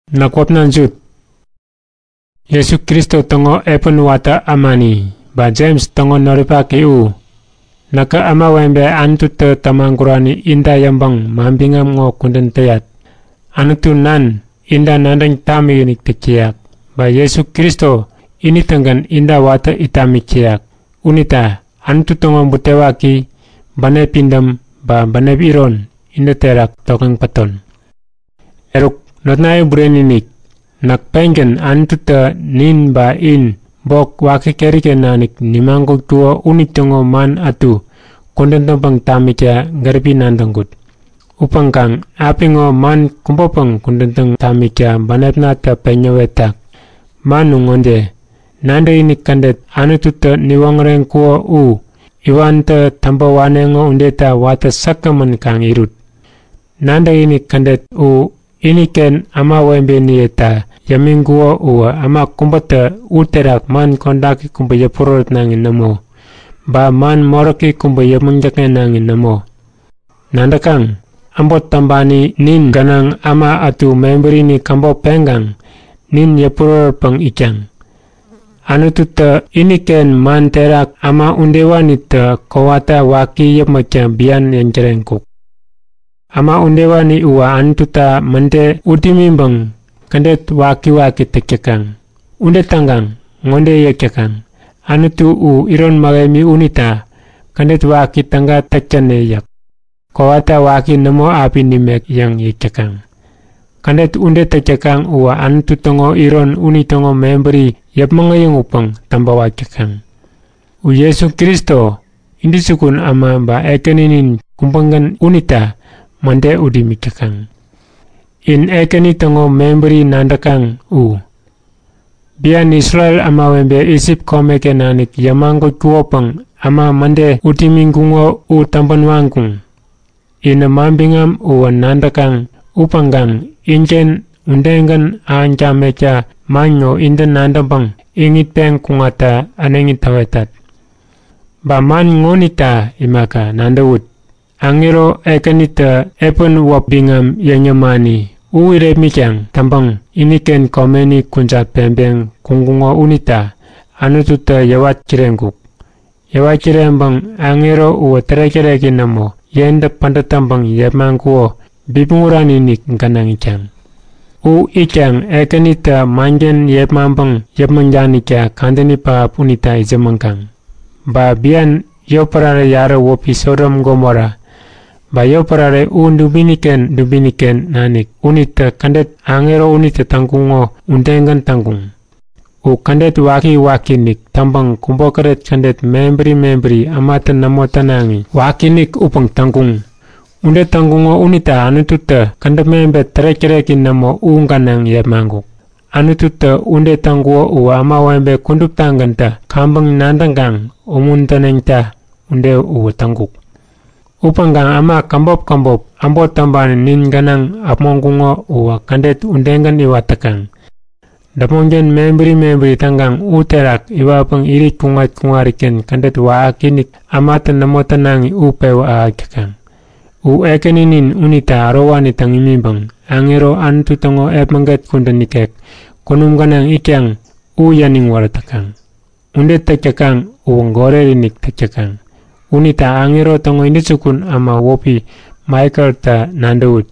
Näk wäpna Jut, Jesu Kristo täŋo epän watä ämani, ba Jems täŋo noripaki u. Näkä ämawebe Anututä tämagurani inta yäŋpäŋ manbiŋam ŋo kudän täŋ tamitat. Anutu Nan inta nadäŋ tamikinik täk täyak. Ba Jesu Kristo ini-tägän inta watä it tamik täyak. Unita Anutu täŋo butewaki, bänep pidäm ba bänep iron intä terak tokŋeŋ päton. Eruk notnaye bureni-inik, näk pengän Anututä nin ba in bok waki keri-ken nanik nimagutkuko unitäŋo man ätu kudän täŋpäŋ tamikta gäripi nadäŋkut. Upäŋkaŋ apiŋo man kubäpäŋ kudän täŋ tamikta bänepnatä peŋ näwetak. Man u ŋode; Nadäkinik kädet Anututä niwoŋäreŋkuko u iwantä täŋpä waneŋo udeta weŋkirek-kirekta pidäm taŋpäŋ kaŋ irut. Nadäkinik kädet u iniken ämawebeniyeta yämiŋkuko uwä äma kubätä uterak man kodaki kubä yäpurärätnaŋi nämo ba man moräki kubä yäpmäŋ täkŋenaŋi nämo. Nadäkaŋ? Äbot täŋpani nin gänaŋ äma ätu mebärini käbop peŋkaŋ nin yäpurärätpäŋ itkaŋ. Anututä iniken man terak äma udewanitä kowata waki yäpmäkta bian yäŋtäreŋkuk. Äma udewani uwä Anututa mäde ut imiŋpäŋ kädet wakiwaki täk täkaŋ. Ude täŋkaŋ ŋode yäk täkaŋ; Anutu u iron mähemi unita kädet waki täga täk täne yäk. Kowata waki nämo api nimek yäŋ yäk täkaŋ. Kädet ude täk täkaŋ uwä Anutu täŋo iron unitäŋo mebäri yäpmäŋ äyäŋutpäŋ täŋpäwak täkaŋ. U Jesu Kristo, nintäŋo Intäjukun Ämanin ba Ekäninin kubägän unita mäde ut imik täkaŋ. In Ekäni täŋo mebäri nadäkaŋ u. Bian Isrel ämawebe Isip komeken nanik yämagutkukopäŋ äma mäde ut imiŋkuŋo u täŋpän waŋkuŋ. Inä manbiŋam uwä nadäkaŋ upäŋkaŋ inken udegän ahäŋ tamekta man ŋo intä nadäŋpäŋ iŋitpeŋ kuŋatta äneŋi täwetat. Ba kubä pen ŋode; Aŋero Ekänitä epän wäp biŋam yäŋ yämani u irepmitkaŋ täŋpäŋ iniken komeni kujat peŋpeŋ kuŋkuŋo unita Anututä yäwat kireŋkuk. Yäwat kireŋpäŋ aŋero uwä yentä pädät täŋpäŋ tärek-täreki nämo yepmaŋkuko bipmäŋ urani-inik gänaŋ itkaŋ. U itkaŋ Ekänitä manken yepmaŋpäŋ yäpmäŋ danikta kadäni pähap unita itsämäŋkaŋ. Ba bian yotpärare yarä wäpi Sodom Gomora, ba yotpärare u dubini-ken dubini-ken nanik unitä kädet aŋero unitä täŋkuŋo udegän täŋkuŋ. U kädet waki-wakiinik täŋpäŋ kubokäret kädet mebäri mebäri ämatä nämo tänaŋi wakiinik upäŋ täŋkuŋ. Ude täŋkuŋo unita Anututä kädäp mebet tärek-täreki nämo u gänaŋ yepmaŋkuk. Anututä ude täŋkuko uwä ämawebe kuduptagäntä kaŋpäŋ nadäŋkaŋ umuntäneŋta ude uwä täŋkuk. Upäŋkaŋ äma käbop käbop äbot täŋpani nin gänaŋ äpmoŋkuŋo uwä kädet udegän iwat täkaŋ. Däpmonken mebäri mebäri täŋkaŋ uterak iwatpäŋ irit kuŋat-kuŋariken kädet wakiinik ämatä nämo tänaŋi u pewä ahäk täkaŋ. U Ekäninin unita ärowani täŋ imiŋpäŋ aŋero Anutu täŋo epmäget kudän ikek kunum gänaŋ itkaŋ u yäniŋ wärät täkaŋ. Ude täk täkaŋ uwä goret-inik täk täkaŋ. Unita aŋero täŋo intäjukun äma wäpi Maikelta nadäwut.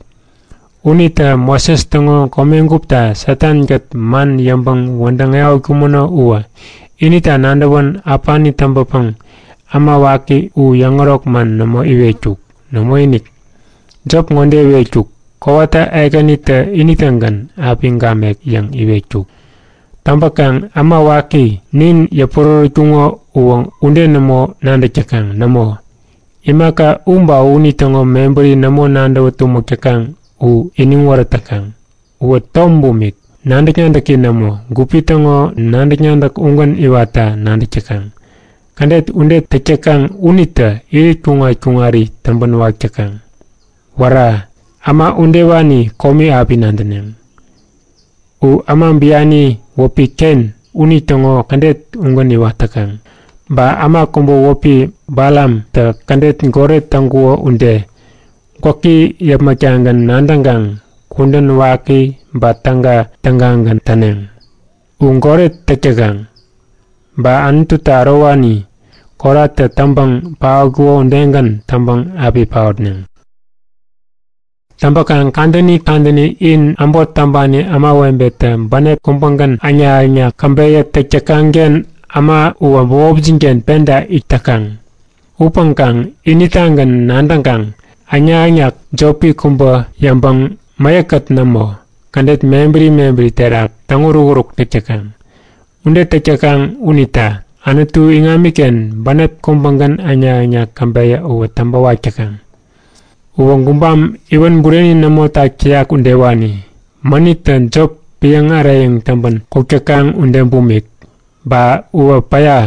Unitä Moses täŋo komegupta Satan-kät man yäŋpäŋ wädäŋ ehätkumäno uwä inita nadäwän äpani täŋpäpäŋ äma waki u yäŋärok man nämo iwetkuk. Nämoinik, jop ŋode iwetkuk; Kowata Ekänitä ini-tägän api gamek yäŋ iwetkuk. Täŋpäkaŋ äma waki nin yäpurärätkuŋo uwä ude nämo nadäk täkaŋ. Nämo, imaka u ba unitäŋo mebäri nämo nadäwä tumäk täkaŋ u iniŋ wärät täkaŋ. Uwä tom bumik, nadäk-nadäki nämo. Gupi täŋo nadäk-nadäk ugän iwatta nadäk täkaŋ. Kädet ude täk täkaŋ unitä irit kuŋat-kuŋari täŋpänwak täkaŋ. Wära! Äma udewani komi api nadäneŋ! U äma biani wäpi Ken unitäŋo kädet ugän iwat täkaŋ. Ba äma kubä wäpi Balamtä kädet goret täŋkuko ude, gwäki yäpmäk-tagän nadäŋkaŋ kudän waki ba täga, tägagän täneŋ. U goret täk täkaŋ. Ba Anututa ärowani, Koratä täŋpäŋ paotkuko udegän täŋpäŋ api paotneŋ. Täŋpäkaŋ kadäni kadäni in äbot täŋpani ämawebetä bänep kubägän äŋnak-äŋnak käbeyä täk täkaŋ-ken äma uwä bämopjin-ken penta it täkaŋ. Upäŋkaŋ initagän nadäŋkaŋ äŋnak-äŋnak jopi kubä yäŋpäŋ mäyäk-kät nämo, kädet mebäri mebäri terak täŋ-urukuruk täk täkaŋ. Ude täk täkaŋ unita Anutu iŋamiken bänep kubägän äŋnak-äŋnak käbeyä uwä täŋpäwak täkaŋ. Uwä gubam iwän bureni nämo tak täyak udewani, mänittä jop piäŋ äreyäŋ täŋpän kuk täkaŋ ude bumik. Ba uwä päya,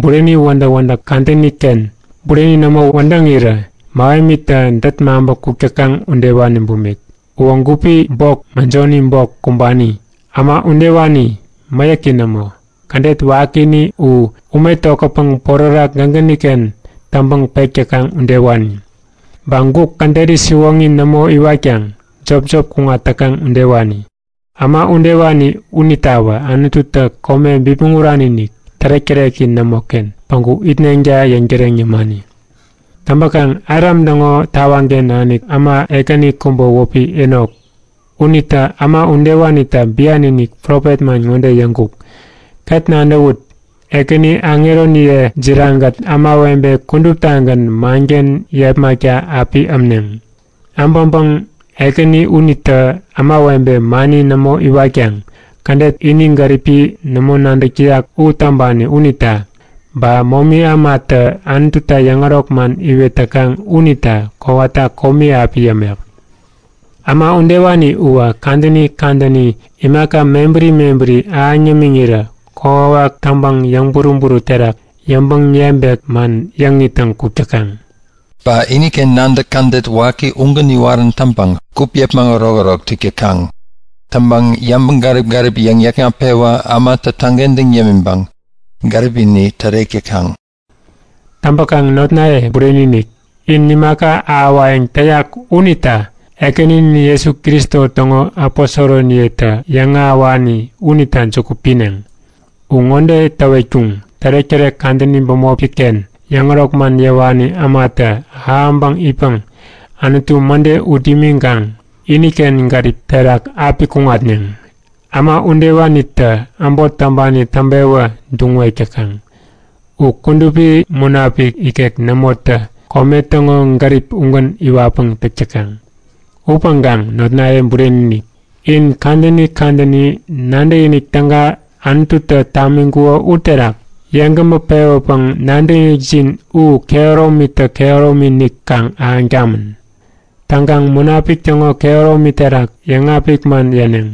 bureni wädäk-wädäk kadäni-ken bureni nämo wädäŋirä mähemitä dät maŋpä kuk täkaŋ udewani bumik. Uwä gupi bok mäjoni bok kumbani. Äma udewani mäyäki nämo. Kädet wakini u ume tokätpäŋ porärak gägäni-ken täŋpäŋ pek täkaŋ udewani. Ba guk käderi siwoŋi nämo iwatkaŋ jopjop kuŋat täkaŋ udewani. Äma udewani unitawä Anututä kome bipmäŋ urani-inik, tärek-täreki nämoken päŋku itneŋta yäŋtäreŋ yämani. Täŋpäkaŋ Adam täŋo tawaŋken nanik äma ekäni kubä wäpi Enok unitä äma udewanita bian-inik profet man ŋode yäŋkuk; Ket nadäwut! Ekäni aŋeroniye jiraŋ-kät ämawebe kuduptagän manken yepmakta api ämneŋ. Äbäŋpäŋ Ekäni unitä ämawebe mani nämo iwatkaŋ kädet ini gäripi nämo nadäk täyak u täŋpani unita, ba momi ämatä Anututa yäŋärok man iwet täkaŋ unita kowata komi api yämek. Äma udewani uwä kadäni kadäni imaka mebäri mebäri ahäŋ yämiŋirä kokwawak täŋpäŋ yäŋburu-buru terak yäŋpäŋ-yebek man yäŋ ittäŋ kuk täkaŋ. Ba iniken nadäk kädet waki ugän iwarän täŋpäŋ gup yäpmäŋ ärokärok täk täkaŋ. Täŋpäŋ yäŋgärip-gärip yäŋ-yäkŋat-pewä ämatä täŋkentäŋ yämäpäŋ gäripini tärek täkaŋ. Täŋpäkaŋ notnaye bureni-inik, in imaka ahäwayäŋ täyak unita Ekäninin Jesu Kristo täŋo aposoroniyetä yäŋahäwani unita juku pineŋ. U ŋode täwetkuŋ; Tärektärek kadäni bämopi-ken yäŋärok man yäwani ämatä ahäŋpäŋ itpäŋ Anutu mäde ut imiŋkaŋ iniken gärip terak api kuŋatneŋ. Äma udewanitä äbot täŋpani täŋpewä duŋwek täkaŋ. U Kudupi Munapik ikek nämotä kome täŋo gärip ugän iwatpäŋ täk täkaŋ. Upäŋkaŋ notnaye bureni-inik, in kadäni kadäni nadäkinik täga Anututä tamiŋkuko uterak yeŋgämä pewäpäŋ nadäkinikjin u kehäromitä kehäromi-inik kaŋ ahäŋ tamän. Täŋkaŋ Munapik täŋo kehäromi terak yäŋapik man yäneŋ.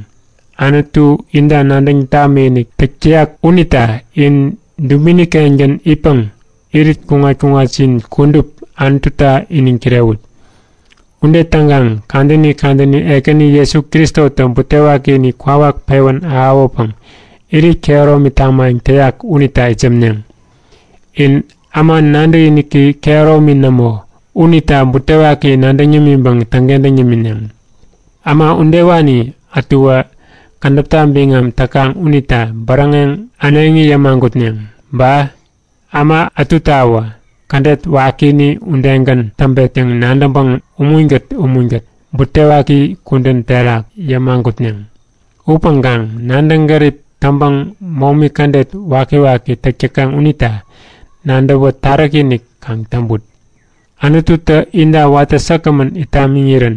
Anutu inta nadäŋ tamikinik täk täyak unita in dubini-kengän itpäŋ irit kuŋat-kuŋatjin kudup Anututa iniŋ kirewut. Ude täŋkaŋ kadäni kadäni Ekäni Jesu Kristotä butewakini kwawak pewän ahäwäpäŋ irit kehäromi tamayäŋ täyak unita itsämneŋ. In äma nadäkiniki kehäromi nämo unita butewaki nadäŋ yämiŋpäŋ täŋkentäŋ yämineŋ. Äma udewani ätuwä kädäpta biŋam täkaŋ unita bäräŋeŋ äneŋi yämagutneŋ. Ba äma ätutawä kädet wakini udegän täŋpet yäŋ nadäŋpäŋ umunkät umunkät butewaki kudän terak yämagutneŋ. Upäŋkaŋ nadäŋ gärip täŋpäŋ momi kädet wakiwaki täk täkaŋ unita nadäwä taräki-inik kaŋ täŋput. Anututä inta watä säkgämän it tamiŋirän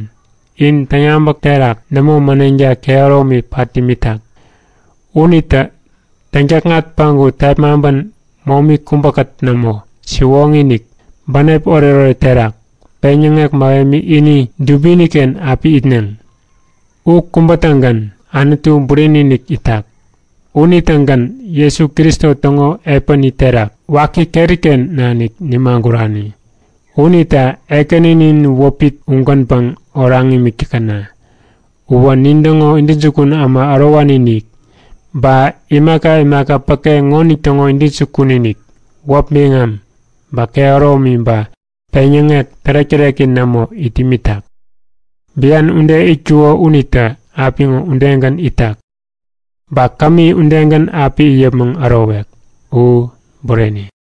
in täŋyabäk terak nämo mäneŋta kehäromi pat imitak. Unitä täŋtäkŋat päŋku tepmaŋpän momi kubäkät nämo, siwoŋi-inik, bänep oretoret terak, peŋyäŋek mähemi ini dubini-ken api itneŋ. U kubä-tägän Anutu bureni-inik itak. Unitägän Jesu Kristo täŋo epäni terak waki keri-ken nanik nimagurani. Unita Ekäninin wäpi ugänpäŋ oraŋ imik täkäna! Uwä nintäŋo intäjukun äma ärowani-inik, ba imaka imaka päke ŋonitäŋo intäjukun-inik. Wäp biŋam, ba kehäromi ba peŋyäŋek tärek-täreki nämo it imitak. Bian ude itkuko unitä apiŋo udegän itak. Ba kämi udegän api it yäpmäŋ ärowek. U Bureni.